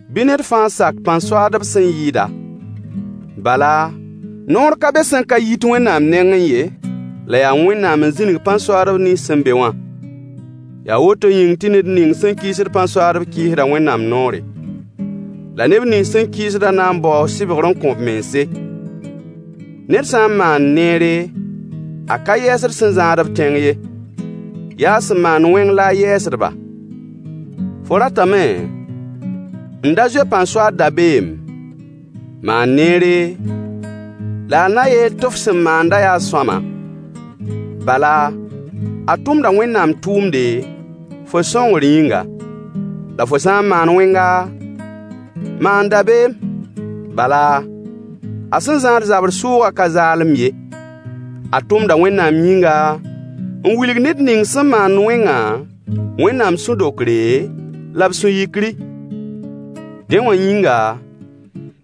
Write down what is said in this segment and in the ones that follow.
Bɩ ned fãa sak pãn-soaadb sẽn yɩɩd-a. Bala, noor ka be sẽn ka yit Wẽnnaam nengẽ ye, la yaa Wẽnnaam n zĩnig pãn-soaadb nins sẽn be wã. Yaa woto yĩng tɩ ned ning sẽn kɩɩsd pãn-soaadb kɩɩsda Wẽnnaam noore. La neb nins sẽn kɩɩsdã na n baoo sɩbgr n kõ b mense. Ned sã n maand neere, a ka yɛɛsd sẽn zãad-b tẽng ye. Yaa a sẽn maand wẽng la a yɛɛsd-ba. Fo ratame n da zoe pãn-soaad dabeem? Maan neere, la a na yeel tɩ f sẽn maanda yaa sõama. Bala, a tʋmda Wẽnnaam tʋʋmde, fo sõngr yĩnga. La fo sã n maan wẽnga, maan dabeem. Bala, a sẽn zãad zabr sʋʋgã ka zaalem ye. A tʋmda Wẽnnaam yĩnga, n wilg ned ning sẽn maand wẽngã Wẽnnaam sũ-dokre, la b sũ-yikri. Dẽ wã yĩnga,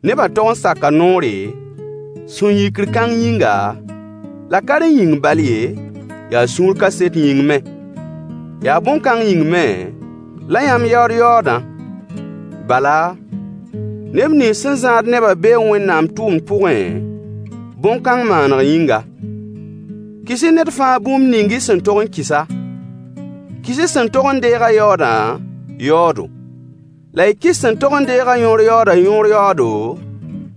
nebã tog n saka noore, sũ-yikr kãng yĩnga, la ka rẽ yĩng bal ye, yaa sũur kaset yĩng me. Yaa bõn-kãng yĩng me la yãmb yaood yaoodã. Bala, neb nins sẽn zãad nebã bee Wẽnnaam tʋʋmd pʋgẽ, bõn-kãng maaneg yĩnga. Kɩs-y ned fãa bũmb ning y sẽn tog n kɩs-a: Kɩs-y sẽn tog n deeg-a yaoodã yaoodo, la y kɩs sẽn tog n deeg-a yõor yaoodã yõor yaoodo,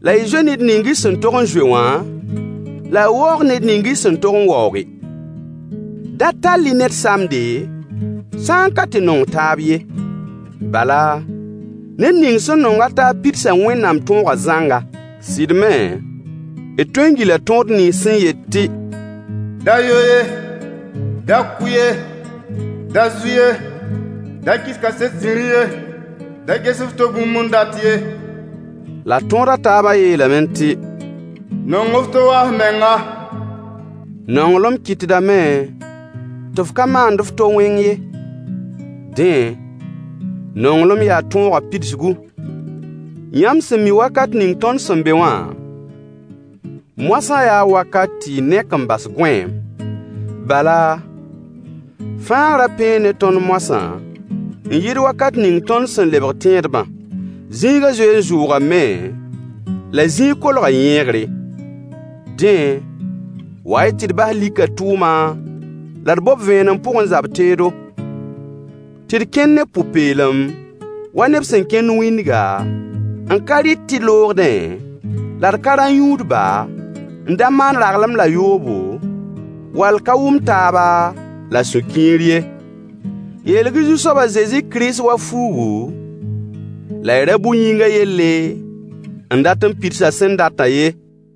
la y zoe ned ning y sẽn tog n zoe wã, la y waoog ned ning y sẽn tog n waooge. Da tall-y ned samde, sã n ka tɩ nong taab ye. Bala, ned ning sẽn nong a taab pidsa Wẽnnaam tõogã zãnga. Sɩd me, d tõee n gila tõod nins sẽn yet tɩ: Da yo ye, da kʋ ye, da zu ye, [da kɩs kaset zĩri ye,] da ges f to bũmb n dat ye, la tõod a taabã yeelame tɩ: Nong f to wa f menga. Nonglem kɩtdame tɩ f ka maand f to wẽng ye. Dẽ, nonglem yaa tõogã pidsgu. Yãmb sẽn mi wakat ning tõnd sẽn be wã, moasã yaa wakat tɩ y nek n bas gõeem. Bala, fãagrã pẽe ne tõnd moasã n yɩɩd wakat ning tõnd sẽn lebg tẽedbã. Zĩigã zoee n zʋʋgame, la zĩig kolga yẽegre. Dẽ, wa-y tɩ d bas likã tʋʋma, la d bob vẽenem pʋgẽ zab-teedo. Tɩ d kẽn ne pʋ-peelem, wa neb sẽn kẽnd wĩndga, n ka rɩt tɩ loogdẽ, la d ka rã-yũudba, n da maan raglem la yoobo, wall ka wʋm-taaba la sũ-kiir ye. Yeelg-y Zu-soab a Zezi Kirist wa fuugu, la y ra bʋ yĩngã yelle n dat n pids a sẽn datã ye.